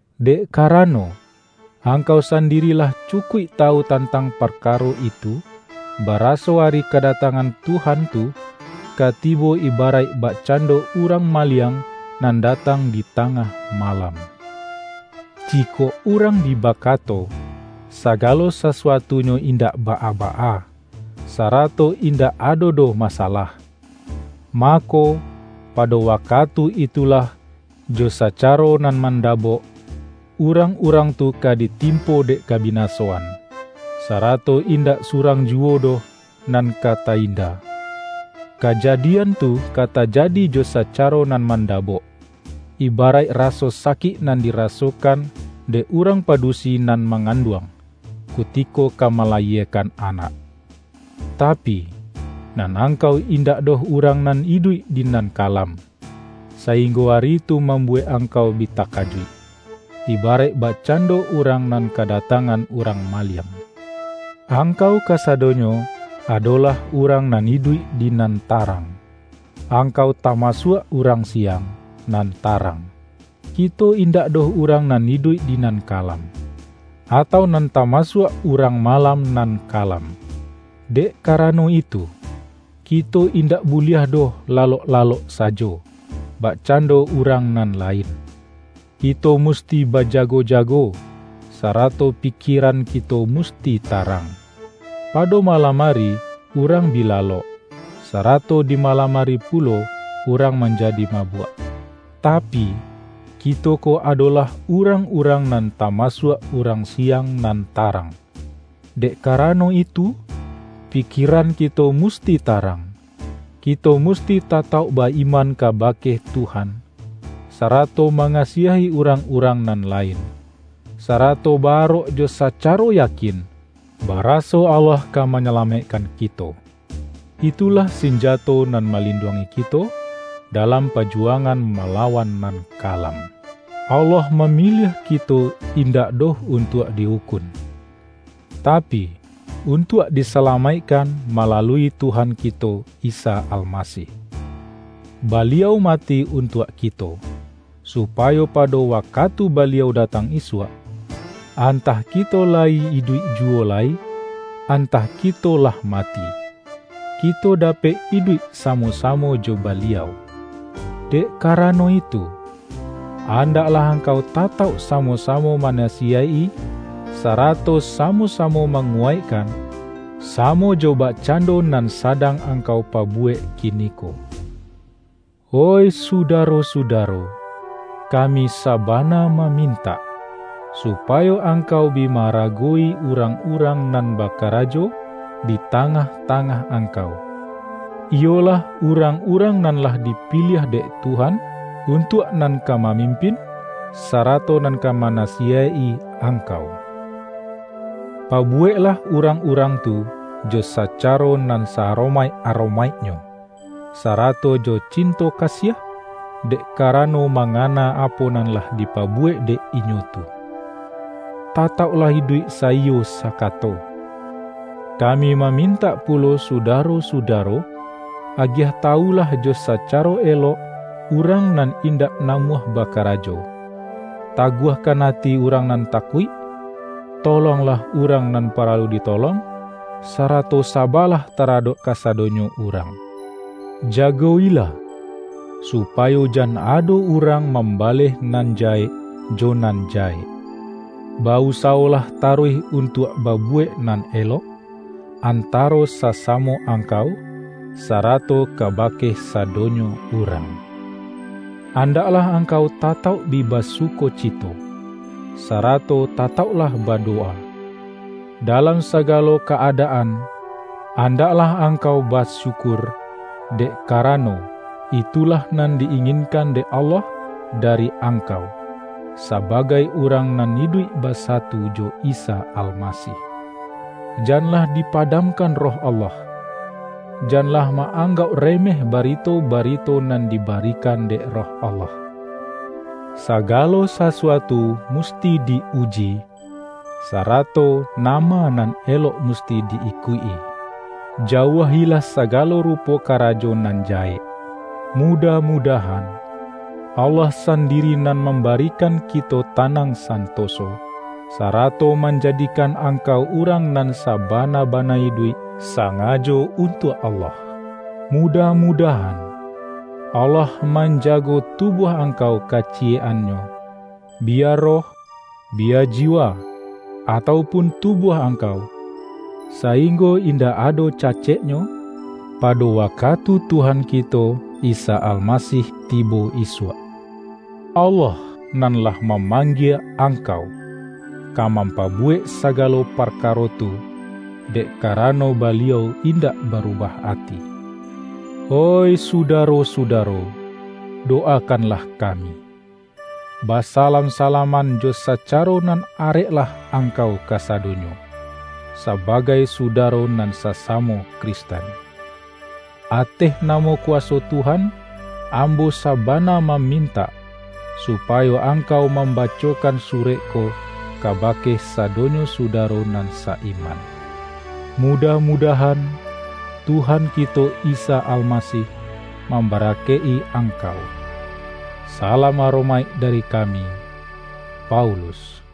Dek karano, angkau sandiri lah cu-kuik tawu tantang parkaro itu, baraso Ari kadatangan Tuhan tu, ka tibo iba-raik bakcando urang maliang nan da-tang di tangah malam. Jikok urang bi bakato,”Sagalo sasuatunyo indak baa-baa, sarato indak ado doh masa-lah,” mako, pado wakatu itulah jo sa-caro nan mandabok, urang-urang tu ka ditimpo dek kabinasoan, sarato indak surang juwo doh nan ka ta-inda. Kaja-dian tu ka tajadi jo sacaro nan manda-bok, ibaraik raso sakik nan dirasokan dek urang padusi nan manganduang, kutiko ka malayiekan anak. Tapi, nan angkau indak doh urang nan iduik di nan kalam, sainggo ari tu mambu-wek angkau bi takajuik, ibaraik bak-cando urang nan kadatangan urang maliang. Angkau kasadonyo adolah urang nan iduik di nan tarang; angkau tamasuak urang siang, nan tarang. Ki-to indak doh urang nan iduik di nan kalam, atau nan tamasuak urang ma-lam nan kalam. Dek karano itu, kito indak buliah doh lalok-lalok sajo, bak-cando urang nan lain. Kito musti ba-jago-jago, sarato pikieran kito musti tarang. Pado malam ari urang bi la-lok, sarato di malam ari pulo urang manjadi mabuak. Tapi, kito ko ado-lah urang-urang nan tamasuak urang siang nan tarang; dek karano itu, pi-kieran kito musti tarang. Kito musti tatauk ba-iman kabake Tuhan, sarato mangasiahi urang-urang nan lain, sa-rato ba-arok jo sacaro yakin, baraso Allah ka manyalamaikkan kito. Itulah sinjato nan malinduangi kito dalam pa-juwangan malawan nan kalam. Allah mamiliah kito indak doh untuak di-ukun, tapi, untuak disalamaikkan ma-lalui Tuhan kito Isa Almasih. Baliau mati untuak kito, supayo pado waka-tu Baliau datang isuak — antah kito la-yi iduik juwo lai, antah kito lah mati — kito dapek iduik samo-samo jo Ba-liau. Dek karano itu, andaklah ang-kau tatauk samo-samo manasiyaik-i, sarato samo-samo manguwaikkan, sa-mo jo bakcando nan sadang angkau pa-buwek kiniko. Oih sudaro-sudaro, kami sabana mamintak, supayo angkau bi ma-arago-wi urang-urang nan bakarajo di tangah-tangah angkau; iyolah urang-urang nan lah dipiliah dek Tuhan, untuak nan ka mamimpin, sarato nan ka manasiyaik-i angkau. Pabuweklah urang-urang tu jo sacaro nan sa-aromaik-aromaiknyo, sarato jo cinto kasiah, dek karano ma-ngana apo nan lah dipabuwek dek inyo tu. Tatauklah iduik saiyo sakato. Kami mamintak pulo sudaro-su-daro, agiah tawulah jo sacaro elok urang nan indak namuah bakarajo; taguahkan ati urang nan takuik; to-longlah urang nan paralu ditolong, sarato saba-lah taradok kasadonyo urang. Jago-ilah, supayo jan ado urang mambaleh nan jahek, jo nan jahek. Ba-usawolah taruih untuak ba-buwek nan elok, antaro sasamo ang-kau, sarato kabake sadonyo urang. Andaklah angkau tatauk bi ba-sukocito, sarato tatauklah badowa. Dalam sagalo ka-adaan, andaklah angkau basyukur, dek karano, itulah nan di-inginkan dek Allah dari ang-kau, sabagai urang nan iduik basatu jo Isa Almasih. Janlah dipadamkan Roh Allah. Janlah ma-anggauk remeh barito-barito nan dibarikan dek Roh Allah. Sagalo sasuatu musti di-uji, sara-to nama nan elok musti di-ikuik-i. Jauah-ilah sagalo rupo karajo nan jahek. Mudah-mudahan, Allah sandiri nan mambarikan kito tanang santo-so, sarato manjadikan angkau urang nan sabana-bana iduik sangajo un-tuak Allah. Mudah-mudahan, Allah manjago tubuah angkau kaciyek-an-nyo, biya roh, biya jiwa, atau pun tubuah angkau, sainggo indak ado caceknyo, pado wakatu Tuhan kito Isa Almasih tibo isuak. Allah, nan lah mamanggie angkau, ka mampa-buwek sagalo parkaro tu, dek kara-no Baliau indak barubah ati. Oih sudaro-sudaro, dowakanlah kami! Basalam-salaman jo sacaro nan areklah angkau kasadonyo, sabagai sudaro nan sasamo Kristen Ateh namo kuwaso Tuhan, ambo sabana mamintak, supayo angkau mambacokan surek ko kabake sadonyo sudaro nan sa-iman. Mudah-mudahan, Tuhan kito Isa Almasih, mambarakaik-i ang-kau. Salam aromaik dari kami, Paulus